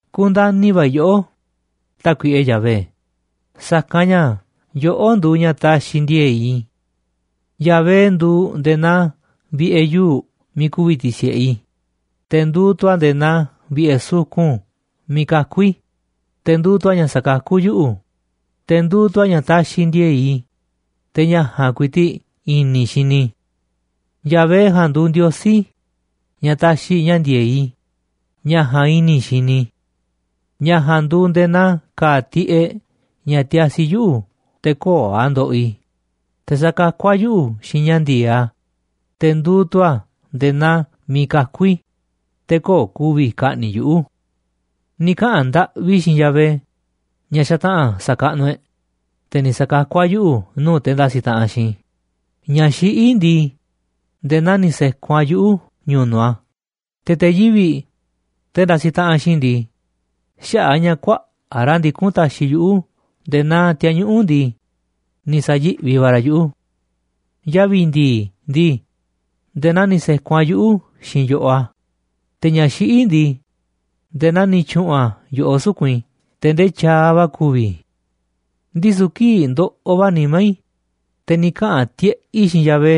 Kundani̱ va̱ i̱ yoꞌó, Tákuiꞌe Yahvé, sa̱kanꞌ ña̱ yoꞌó nduuꞌ ña̱ taxiꞌ ndi̱e̱e̱ꞌ i̱. Yahvé nduuꞌ nde̱e̱ naa vi̱ꞌe̱ yuu̱ꞌ miiꞌ ku̱vi̱ ti̱si̱ꞌe i̱, te̱ nduuꞌ tu̱ a̱ nde̱e̱ naa vi̱ꞌe̱ sukun miiꞌ kakú i̱, te̱ nduuꞌ tu̱ a̱ ña̱ sakakú yuꞌu̱, te̱ nduuꞌ tu̱ a̱ ña̱ taxiꞌ ndi̱e̱e̱ꞌ i̱, te̱ ña̱ ja̱a̱nꞌ ku̱i̱ti̱ꞌ i̱ni̱ i̱ xini i̱. Yahvé ja̱a̱nꞌ nduuꞌ Ndiosí i̱, ña̱ taxiꞌ ña̱ ndi̱e̱eꞌ i̱, ña̱ ja̱a̱nꞌ i̱ni̱ i̱ xini i̱. Ña̱ ja̱a̱nꞌ nduuꞌ nde̱e̱ naa ka̱a̱ tiꞌeꞌ ña̱ tiasi yuꞌu̱ te̱ köo̱ꞌ a̱ ndoꞌoꞌ i̱, te̱ sakakú a̱ yuꞌu̱ xiinꞌ ña̱ ndi̱e̱eꞌ a̱, te̱ nduuꞌ tu̱ a̱ nde̱e̱ naa miiꞌ kakú i̱, te̱ köo̱ꞌ ku̱vi̱ ka̱ꞌni̱ꞌ yuꞌu̱. Ni̱ kaꞌa̱n ndaꞌvi i̱ xiinꞌ Yahvé, ña̱ xataꞌa̱n sa̱kaꞌnuꞌ e̱ꞌ, te̱ ni̱ sa̱kakú a̱ yuꞌu̱ nuu̱ꞌ te̱ ndasiꞌ taꞌanꞌ xiinꞌ i̱, Ña̱ xiꞌí ndii, nde̱e̱ naa ni̱ se̱kun a̱ yuꞌu̱ ñu̱nu̱ꞌ a̱, te̱ te̱ yivi̱ꞌ, te̱ ndasiꞌ taꞌanꞌ xiinꞌ i̱ ndii, xaꞌa̱ꞌ a̱ ña̱ kuaꞌa̱ꞌ ra̱ ndikún taxiꞌ yuꞌu̱ nde̱e̱ naa ti̱a̱ñuꞌu̱ꞌ ndii, ni̱ sa̱yi̱ꞌvi va̱ ra̱ yuꞌu̱. Yavi̱ ndi̱i̱ ndii, nde̱e̱ naa ni̱ se̱kun a̱ yuꞌu̱ xiinꞌ yo̱ꞌoꞌ a̱, te̱ ña̱ xiꞌí ndii, nde̱e̱ naa ni̱ tyu̱ꞌu̱n a̱ yo̱ꞌoꞌ suku̱nꞌ i̱ te̱ ndee tyaaꞌ va̱ ku̱vi̱ i̱. Ndisu̱ kii̱ꞌ ndoꞌoꞌ va̱ nimá i̱, te̱ ni̱ kaꞌa̱n tiꞌeꞌ i̱ xiinꞌ Yahvé,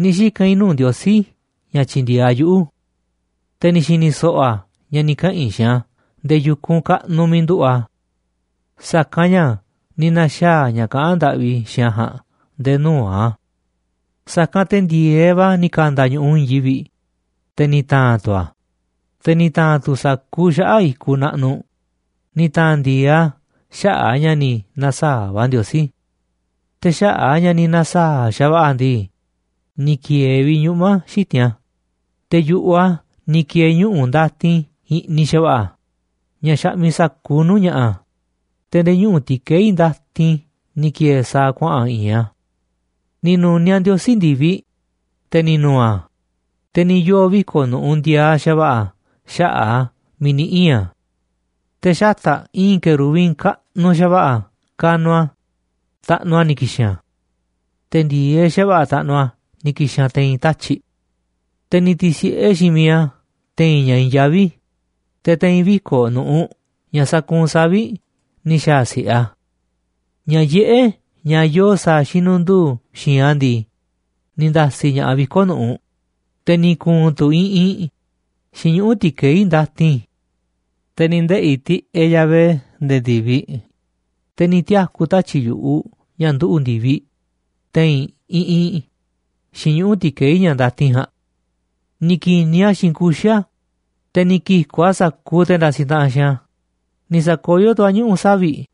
ni̱ xika̱n i̱ nuu̱ꞌ Ndiosí i̱ ña̱ tyi̱ndi̱e̱eꞌ a̱ yuꞌu̱. Te̱ ni̱ xi̱ni̱ so̱ꞌo̱ a̱ ña̱ ni̱ kaꞌa̱n i̱ xiinꞌ a̱ nde̱e̱ yu̱kunꞌ kaꞌnuꞌ miiꞌ nduꞌu̱ꞌ a̱. Sa̱kanꞌ ña̱ ni̱ na̱xaa̱ ña̱ kaꞌán ndaꞌvi i̱ xiinꞌ a̱ ja̱a̱nꞌ nde̱e̱ nuu̱ꞌ a̱. Sa̱kanꞌ te̱ ndi̱e̱eꞌ va̱ ni̱ ka̱nda̱ ñu̱ꞌuꞌ i̱i̱n yivi̱ꞌ, te̱ ni̱ ta̱a̱n tu̱ a̱, te̱ ni̱ ta̱a̱n tu̱ sa̱kuuꞌ xaꞌa̱ꞌ i̱kuꞌ naꞌnuꞌ, ni̱ ta̱a̱n ndi̱e̱eꞌ a̱ xaꞌa̱ꞌ a̱ ña̱ ni̱ na̱saa̱ꞌ va̱ Ndiosí. Te̱ xaꞌa̱ꞌ a̱ ña̱ ni̱ na̱saa̱ꞌ xa̱va̱ꞌa̱ a̱ ndii, ni̱ ki̱e̱e̱ vi̱ꞌ ñuꞌma̱ xiti̱nꞌ a̱, te̱ yu̱ꞌuꞌ a̱ ni̱ ki̱e̱e̱ ñuꞌu̱ ndatin i̱ꞌniꞌ xa̱va̱ꞌa̱ ña̱ xaꞌmiꞌ sa̱kuuꞌ nuu̱ꞌ ña̱ꞌa̱, te̱ nde̱e̱ ñuꞌu̱ ti̱keí ndatin ni̱ ki̱e̱e̱ sa̱a̱ kuaꞌa̱n i̱i̱nꞌ a̱. Ni̱ nu̱niaꞌ Ndiosí ndi̱viꞌ, te̱ ni̱ nu̱u̱ a̱, te̱ ni̱ yoo̱ viko̱ꞌ nu̱ꞌuꞌ ndiaaꞌ xa̱va̱ꞌa̱ xaꞌa̱ꞌ a̱ miiꞌ ni̱ ii̱n a̱. Te̱ xata̱ꞌ i̱i̱n querubín kaꞌnuꞌ xa̱va̱ꞌa̱ kanuꞌ a̱, taꞌnuꞌ a̱ ni̱ ki̱xi̱n a̱. Te̱ ndi̱e̱eꞌ xa̱va̱ꞌa̱ taꞌnuꞌ a̱ ni̱ ki̱xi̱n a̱ te̱i̱n tatyi̱ꞌ. Te̱ ni̱ ti̱si̱ꞌe xiinꞌ miiꞌ a̱ te̱i̱n ña̱ i̱i̱n yaví, te̱ te̱i̱n viko̱ꞌ nu̱ꞌuꞌ ña̱ sakuunꞌ savi̱ꞌ ni̱ xa̱a̱ si̱ꞌe a̱. Ña̱ yiꞌé, ña̱ yoo sa̱a̱ xinundu̱u̱ xi̱i̱nꞌ a̱ ndii, ni̱ nda̱si̱ ña̱ꞌaꞌ viko̱ꞌ nu̱ꞌuꞌ, te̱ ni̱ ku̱u̱n tu̱ iꞌinꞌ xiinꞌ ñuꞌu̱ ti̱keí ndatin. Te̱ ni̱ ndeꞌi̱ tiꞌeꞌ Yahvé nde̱e̱ ndi̱viꞌ, te̱ ni̱ tiaku̱ tatyi̱ꞌ yu̱ꞌuꞌ ña̱ nduꞌu̱ ndi̱viꞌ te̱i̱n iꞌinꞌ xiinꞌ ñuꞌu̱ ti̱keí ña̱ ndatin ja̱a̱nꞌ. Ni̱ ki̱niꞌ a̱ xiinꞌ kuxi̱ a̱, te̱ ni̱ ki̱ku̱ꞌ a̱ sa̱kuuꞌ te̱ ndasiꞌ taꞌanꞌ xiinꞌ a̱, ni̱ sa̱koyó tu̱ a̱ ñuꞌu̱ savi̱ꞌ,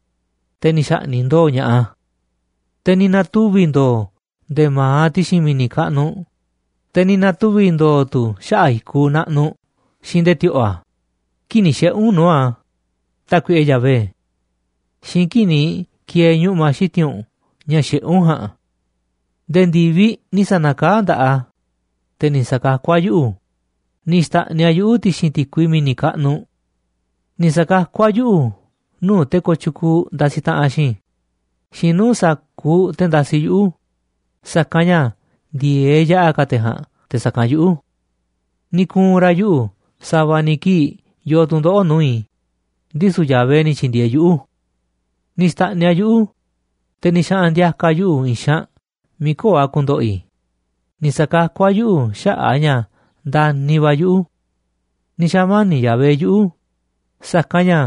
te̱ ni̱ xa̱ꞌni̱ꞌ ndo̱o̱ ña̱ꞌaꞌ a̱. Te̱ ni̱ na̱tuvi̱ ndo̱o̱ nde̱ma̱aꞌ ti̱xi̱n mi̱ni̱ kaꞌnuꞌ, te̱ ni̱ na̱tuvi̱ ndo̱o̱ tu̱ xaꞌa̱ꞌ i̱kuꞌ naꞌnuꞌ xiinꞌ nde̱e̱ ti̱o̱ꞌo̱ a̱ kii̱ꞌ ni̱ xiꞌe̱ u̱nꞌ nuu̱ꞌ a̱, Tákuiꞌe Yahvé, xiinꞌ kii̱ꞌ ni̱ ki̱e̱e̱ ñuꞌma̱ xiti̱nꞌ u̱nꞌ ña̱ xiꞌé u̱nꞌ ja̱a̱nꞌ. Nde̱e̱ ndi̱viꞌ ni̱ sa̱na̱kaá nda̱ꞌaꞌ a̱, te̱ ni̱ sa̱kakú a̱ yuꞌu̱, ni̱ xta̱ꞌniꞌ a̱ yuꞌu̱ ti̱xi̱n ti̱kui mi̱ni̱ kaꞌnuꞌ. Ni̱ sa̱kakú a̱ yuꞌu̱ nuu̱ꞌ te̱ kooꞌ tyukuuꞌ ndasiꞌ taꞌanꞌ xiinꞌ i̱ xiinꞌ nuu̱ꞌ sa̱kuuꞌ te̱ ndasiꞌ yuꞌu̱, sa̱kanꞌ ña̱ ndi̱e̱eꞌ yaꞌa̱ ka̱ te̱ ja̱a̱nꞌ te̱ sa̱kanꞌ yuꞌu̱. Ni̱ ku̱u̱n ra̱ yuꞌu̱ sa̱va̱ ni̱ kii̱ꞌ yoo tu̱ndoꞌo̱ꞌ nuu̱ꞌ i̱, ndisu̱ Yahvé ni̱ tyi̱ndi̱e̱eꞌ yuꞌu̱. Ni̱ xta̱ꞌniꞌ a̱ yuꞌu̱, te̱ ni̱ xaꞌa̱n ndi̱a̱ka̱ a̱ yuꞌu̱ i̱i̱n xaanꞌ miiꞌ köo̱ꞌ a̱ ku̱ndo̱ꞌo̱ i̱, ni̱ sa̱kakú a̱ yuꞌu̱ xaꞌa̱ꞌ a̱ ña̱ ndani̱ va̱ a̱ yuꞌu̱. Ni̱ xa̱mani̱ꞌ Yahvé yuꞌu̱, sa̱kanꞌ ña̱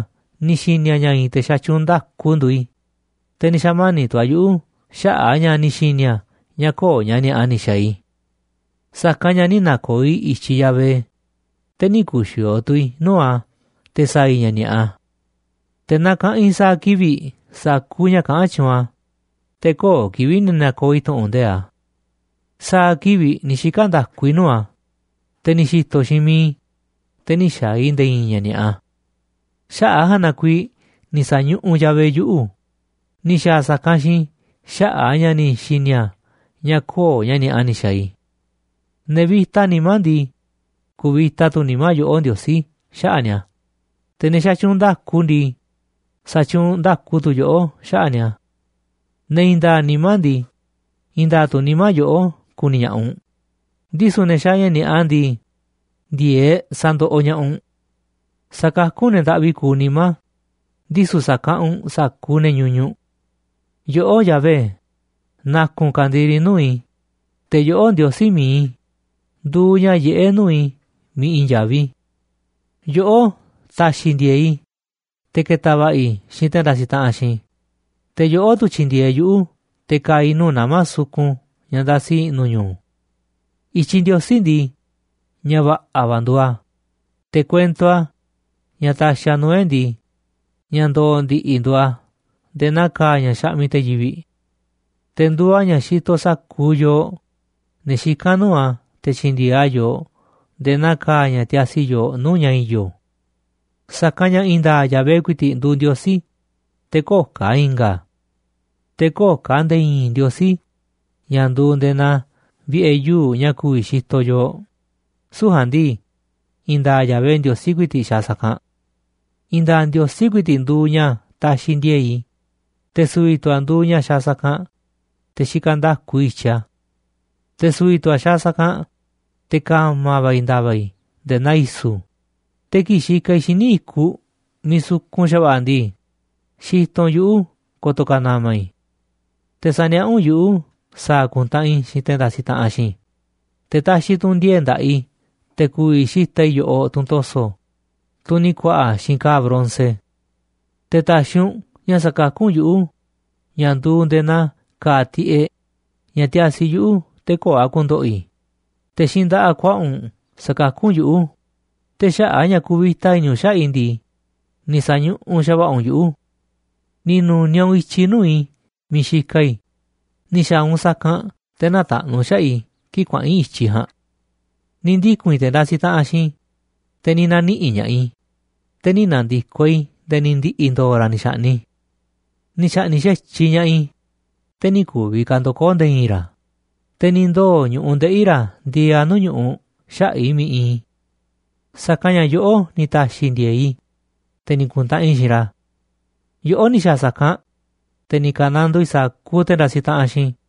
ni̱ xi̱ni̱ a̱ ña̱ i̱i̱n te̱ xatyuunꞌ nda̱ku nduuꞌ i̱, te̱ ni̱ xa̱mani̱ꞌ tu̱ a̱ yuꞌu̱ xaꞌa̱ꞌ a̱ ña̱ ni̱ xi̱ni̱ a̱ ña̱ köo̱ꞌ ña̱ ni̱a̱ꞌa ni̱ xa̱a̱ i̱. Sa̱kanꞌ ña̱ nï̱ na̱ko̱o̱ i̱ i̱tyiꞌ Yahvé, te̱ nï̱ ku̱xi̱o̱o̱ tu̱ i̱ nuu̱ꞌ a̱ te̱ sa̱a̱ i̱ ña̱ ni̱a̱ꞌa. Te̱ nakaꞌanꞌ i̱ sa̱a̱ kivi̱ꞌ sa̱kuuꞌ ña̱ kaꞌán tyuunꞌ a̱, te̱ köo̱ꞌ kivi̱ꞌ ni̱ na̱ko̱o̱ i̱ tu̱ꞌu̱n nde̱iꞌ a̱. Sa̱a̱ kivi̱ꞌ ni̱ xika̱ nda̱ku i̱ nuu̱ꞌ a̱, te̱ ni̱ xi̱to̱ xiinꞌ miiꞌ i̱, te̱ nï̱ xa̱a̱ i̱ nde̱e̱ i̱i̱n ña̱ ni̱a̱ꞌa. Xaꞌa̱ꞌ ja̱a̱nꞌ na kuiiꞌ ni̱ sa̱ñuꞌuꞌ Yahvé yuꞌu̱, ni̱ xa̱a̱ a̱ sa̱kanꞌ xiinꞌ i̱ xaꞌa̱ꞌ a̱ ña̱ ni̱ xi̱ni̱ a̱ ña̱ köo̱ꞌ ña̱ ni̱a̱ꞌa ni̱ xa̱a̱ i̱. Ne̱ vi̱ta nimá ndii, ku̱vi̱ta tu̱ nimá yoꞌó, Ndiosí, xaꞌa̱ꞌ ni̱a̱, te̱ ne̱ xatyuunꞌ nda̱ku ndii, sa̱tyuunꞌ nda̱ku tu̱ yoꞌó xaꞌa̱ꞌ ni̱a̱. Ne̱ i̱i̱n nda̱a̱ꞌ nimá ndii, i̱i̱n nda̱a̱ꞌ tu̱ nimá yoꞌó ku̱ni̱ ña̱ꞌaꞌ u̱nꞌ, ndisu̱ ne̱ xaaꞌ ña̱ ni̱a̱ꞌa ndii, ndi̱e̱eꞌ sa̱ndoꞌoꞌ ña̱ꞌaꞌ u̱nꞌ. Sakakú u̱nꞌ ne̱ ndaꞌvi kuuꞌ nimá, ndisu̱ sakaꞌanꞌ u̱nꞌ sa̱kuuꞌ ne̱ ñuñuꞌ. Yoꞌó, Yahvé, na̱ku̱nꞌ u̱nꞌ ka̱ndiri nuu̱ꞌ i̱, te̱ yoꞌó, Ndiosí mi̱iꞌ i̱, nduuꞌ ña̱ yiꞌé nuu̱ꞌ i̱ miiꞌ i̱i̱n yaví. Yoꞌó ta̱xi̱ ndi̱e̱e̱ꞌ i̱ te̱ ke̱ta̱ va̱ꞌa̱ i̱ xiinꞌ te̱ ndasiꞌ taꞌanꞌ xiinꞌ i̱, te̱ yoꞌó tu̱ tyi̱ndi̱e̱eꞌ yuꞌu̱ te̱ ka̱a̱ i̱ nuu̱ꞌ nama̱ sukun ña̱ ndasi i̱ꞌnu̱ ñu̱u̱. I̱tyiꞌ Ndiosí ndii, ña̱ va̱ꞌa̱ va̱ nduuꞌ a̱. Te̱ kuento a̱, ña̱ taxiꞌ a̱ nuu̱ꞌ e̱ꞌ ndii, ña̱ ndo̱o̱ ndi̱ꞌi̱ nduuꞌ a̱ nde̱e̱ naa ka̱a̱ ña̱ xaꞌmiꞌ te̱ yivi̱ꞌ. Te̱ nduuꞌ a̱ ña̱ xitoꞌ sa̱kuuꞌ yooꞌ, ne̱ xikán nuu̱ꞌ a̱, te̱ tyi̱ndi̱e̱eꞌ a̱ yooꞌ nde̱e̱ naa ka̱a̱ ña̱ tiasi yoo nuu̱ꞌ ña̱ i̱yo̱. Sa̱kanꞌ ña̱ i̱i̱n nda̱a̱ꞌ Yahvé ku̱i̱ti̱ꞌ nduuꞌ Ndiosí, te̱ köo̱ꞌ ka̱ i̱nga̱ a̱. Te̱ köo̱ꞌ ka̱ nde̱e̱ i̱i̱n ndiosí ña̱ nduuꞌ nde̱e̱ naa vi̱ꞌe̱ yuu̱ꞌ ña̱ ku̱vi̱ xitoꞌ yooꞌ, süu̱ꞌ ja̱a̱nꞌ ndii, i̱i̱n nda̱a̱ꞌ Yahvé Ndiosí ku̱i̱ti̱ꞌ xaaꞌ sa̱kanꞌ. I̱i̱n nda̱a̱ꞌ Ndiosí ku̱i̱ti̱ꞌ nduuꞌ ña̱ taxiꞌ ndi̱e̱e̱ꞌ i̱, te̱ su̱vi̱ tu̱ a̱ nduuꞌ ña̱ xaaꞌ sa̱kanꞌ, te̱ xikaꞌ nda̱ku i̱ i̱tyiꞌ a̱. Te̱ su̱vi̱ tu̱ a̱ xaaꞌ sa̱kanꞌ, te̱ ka̱ma̱ va̱ i̱ nda̱va̱ i̱ nde̱e̱ naa i̱su̱, te̱ kii̱ꞌ xikaꞌ i̱ xíniꞌ i̱kuꞌ miiꞌ sukun xa̱va̱ꞌa̱ ndii, xitoꞌ u̱nꞌ yuꞌu̱ ko̱to̱ ka̱ na̱ma̱ i̱. Te̱ saniaꞌá u̱nꞌ yuꞌu̱ sa̱a̱ ku̱ntaꞌanꞌ i̱ xiinꞌ te̱ ndasiꞌ taꞌanꞌ xiinꞌ i̱, te̱ taxiꞌ tu̱ u̱nꞌ ndi̱e̱e̱ꞌ nda̱ꞌaꞌ i̱ te̱ ku̱vi̱ xi̱ta̱ꞌ i̱ yo̱ꞌoꞌ tunꞌ to̱so̱, tunꞌ ni̱ ku̱a̱ꞌa̱ xiinꞌ ka̱a̱ bronce. Te̱ ta̱xi̱ u̱nꞌ ña̱ sa̱kakú u̱nꞌ yuꞌu̱, ña̱ nduuꞌ nde̱e̱ naa ka̱a̱ tiꞌeꞌ, ña̱ tiasi yuꞌu̱ te̱ köo̱ꞌ a̱ ku̱ndo̱ꞌo̱ i̱, te̱ xiinꞌ nda̱ꞌaꞌ kuaꞌa u̱nꞌ sakakú u̱nꞌ yuꞌu̱, te̱ xaꞌa̱ꞌ a̱ ña̱ kuvita i̱ni̱ u̱nꞌ xaꞌa̱ꞌ i̱ ndii, ni̱ sa̱ñuꞌuꞌ xa̱va̱ꞌa̱ u̱nꞌ yuꞌu̱. Ni̱ nu̱niaꞌ u̱nꞌ i̱tyiꞌ nuu̱ꞌ i̱ miiꞌ xikaꞌ i̱, ni̱ xa̱a̱ u̱nꞌ sa̱kanꞌ te̱ nä̱taꞌnu̱ xaꞌa̱ꞌ i̱ kii̱ꞌ kuaꞌa̱n i̱ i̱tyiꞌ ja̱a̱nꞌ. Ni̱ ndiku̱n i̱ te̱ ndasiꞌ taꞌanꞌ xiinꞌ i̱, te̱ ni̱ na̱niꞌi̱ꞌ ña̱ꞌaꞌ i̱, te̱ nï̱ na̱ndi̱koꞌ i̱ nde̱e̱ ni̱ ndi̱ꞌi̱ ndo̱o̱ ra̱ ni̱ xa̱ꞌni̱ꞌ i̱. Ni̱ xa̱ꞌni̱ꞌ xa̱tyiꞌ ña̱ꞌaꞌ i̱, te̱ nï̱ ku̱vi̱ ka̱ ndo̱koo̱ nde̱e̱ i̱i̱n ra̱, te̱ ni̱ ndoo̱ ñu̱ꞌuꞌ ndeꞌi̱ ra̱ ndieeꞌ a̱ ñu̱ꞌuꞌ xaꞌa̱ꞌ i̱ miiꞌ iinꞌ. Sa̱kanꞌ ña̱ yoꞌó ni̱ ta̱xi̱ ndi̱e̱e̱ꞌ i̱, te̱ ni̱ ku̱ntaꞌanꞌ i̱ xiinꞌ ra̱. Yoꞌó ni̱ xa̱a̱ sa̱kanꞌ, te̱ ni̱ ka̱nandoo i̱ sa̱kuuꞌ te̱ ndasiꞌ taꞌanꞌ xiinꞌ i̱.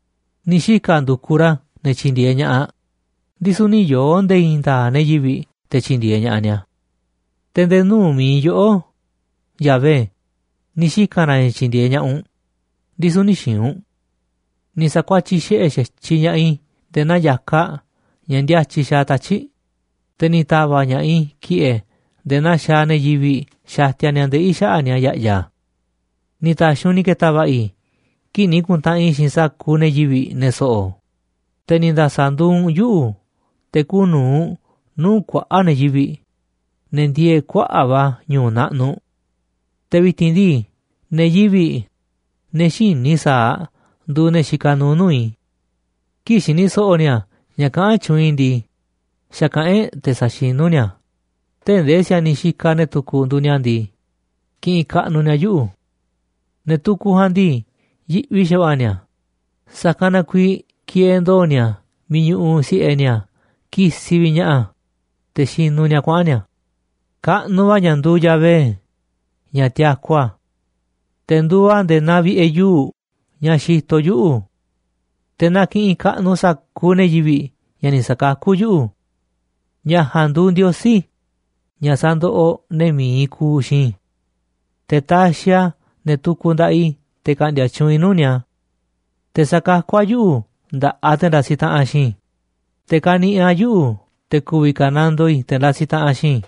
Ni̱ xika̱ ndu̱kuꞌ ra̱ ne̱ tyi̱ndi̱e̱eꞌ ña̱ꞌaꞌ, ndisu̱ nï̱ yoo̱ nde̱e̱ i̱i̱n nda̱a̱ꞌ ne̱ yivi̱ꞌ te̱ tyi̱ndi̱e̱eꞌ ña̱ꞌaꞌ ni̱a̱. Te̱ nde̱e̱ nuu̱ꞌ mi̱iꞌ yoꞌó, Yahvé, ni̱ xika̱n ra̱ ña̱ tyi̱ndi̱e̱eꞌ ña̱ꞌaꞌ u̱nꞌ, ndisu̱ nï̱ xi̱i̱nꞌ u̱nꞌ. Ni̱ sa̱kuatyiꞌ xiꞌe̱ xa̱tyiꞌ ña̱ꞌaꞌ i̱ nde̱e̱ naa ya̱kaꞌ ña̱ ndíátyiꞌ xaaꞌ tatyi̱ꞌ, te̱ ni̱ ta̱va̱ꞌ ña̱ꞌaꞌ i̱ ki̱ꞌe̱ nde̱e̱ naa xaaꞌ ne̱ yivi̱ꞌ xatia ni̱a̱ ndeꞌi̱ xaꞌa̱ꞌ ni̱a̱ ya̱ꞌya̱. Ni̱ ta̱xi̱ u̱nꞌ ni̱ ke̱ta̱ va̱ꞌa̱ i̱ kii̱ꞌ ni̱ ku̱ntaꞌanꞌ i̱ xiinꞌ sa̱kuuꞌ ne̱ yivi̱ꞌ, ne̱ so̱ꞌo̱, te̱ ni̱ nda̱sa̱ nduuꞌ u̱nꞌ yuꞌu̱ te̱ kuuꞌ nu̱uꞌ nuu̱ꞌ kuaꞌa̱ꞌ ne̱ yivi̱ꞌ, ne̱ ndieeꞌ kuaꞌa̱ꞌ va̱ ñu̱u̱ naꞌnuꞌ. Te̱ vi̱ti̱n ndii, ne̱ yivi̱ꞌ, ne̱ xïní i̱, sa̱aꞌ nduuꞌ ne̱ xikaꞌ nuuꞌ nuu̱ꞌ i̱. Kii̱ꞌ xini so̱ꞌo̱ ni̱a̱ ña̱ kaꞌán tyuunꞌ i̱ ndii, xa̱kaꞌán e̱ꞌ te̱ saxinú ni̱a̱ a̱, tee̱ꞌ ndee si̱a̱niꞌ xikaꞌ ne̱ tukuꞌ nduuꞌ ni̱a̱ ndii, kiꞌinꞌ kaꞌnuꞌ ni̱a̱ yuꞌu̱. Ne̱ tukuꞌ ja̱a̱nꞌ ndii, yiꞌvi xa̱va̱ꞌa̱ ni̱a̱, sa̱kanꞌ na kuiiꞌ kieeꞌ ndo̱o̱ ni̱a̱ miiꞌ ñuꞌuꞌ si̱ꞌe ni̱a̱ kisiꞌ vi̱ꞌ ña̱ꞌaꞌ a̱, te̱ xinuꞌ ni̱a̱ kuaꞌa̱n ni̱a̱. Kaꞌnuꞌ va̱ ña̱ nduuꞌ Yahvé, ña̱ tiaku a̱. Te̱ nduuꞌ a̱ nde̱e̱ naa vi̱ꞌe̱ yuu̱ꞌ, ña̱ xitoꞌ yuꞌu̱. Te̱ na ki̱ꞌi̱n kaꞌnuꞌ sa̱kuuꞌ ne̱ yivi̱ꞌ ña̱ ni̱ sa̱kakú yuꞌu̱. Ña̱ ja̱a̱nꞌ nduuꞌ Ndiosí, ña̱ sandoꞌoꞌ ne̱ mi̱iꞌ kuuꞌ xiinꞌ i̱. Te̱ taxiꞌ a̱ ne̱ tukuꞌ nda̱ꞌaꞌ i̱ te̱ ka̱ꞌndi̱a̱ tyuunꞌ i̱ nuu̱ꞌ ni̱a̱. Te̱ sakakú a̱ yuꞌu̱ nda̱ꞌaꞌ te̱ ndasiꞌ taꞌanꞌ xiinꞌ i̱, te̱ kaniꞌiꞌ a̱ yuꞌu̱ te̱ ku̱vi̱ kanandoo i̱ te̱ ndasiꞌ taꞌanꞌ xiinꞌ i̱.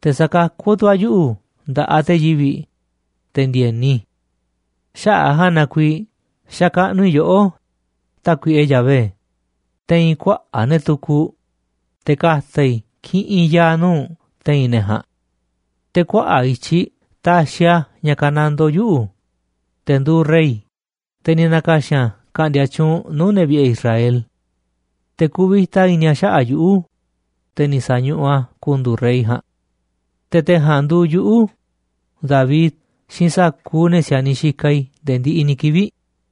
Te̱ sakakú tu̱ a̱ yuꞌu̱ nda̱ꞌaꞌ te̱ yivi̱ꞌ, te̱ ndi̱e̱ni. Xaꞌa̱ꞌ a̱ ja̱a̱nꞌ na kuiiꞌ xakaꞌnuꞌ i̱ yoꞌó, Tákuiꞌe Yahvé, te̱i̱n kuaꞌa̱ꞌ ne̱ tukuꞌ, te̱ ka̱ta̱ i̱ kiꞌinꞌ ya̱a̱ nuu̱ꞌ u̱nꞌ te̱i̱n ne̱ ja̱a̱nꞌ. Te̱ kuaꞌa̱ꞌ i̱tyiꞌ taxiꞌ a̱ ña̱ ka̱nandoo yuꞌu̱, te̱ nduuꞌ rey, te̱ ni̱ na̱ka̱xi̱n a̱ ka̱ꞌndi̱a̱ tyuunꞌ nuu̱ꞌ ne̱ vi̱ꞌe̱ Israel. Te̱ kuvita i̱ni̱ a̱ xaꞌa̱ꞌ yuꞌu̱, te̱ ni̱ sa̱ñuꞌuꞌ a̱ ku̱ndu̱u̱ rey ja̱a̱nꞌ. Te̱ te̱ ja̱a̱nꞌ nduuꞌ yuꞌu̱, David, xiinꞌ sa̱kuuꞌ ne̱ si̱a̱niꞌ xikaꞌ i̱ nde̱e̱ ndiꞌiꞌ ni̱ kivi̱ꞌ.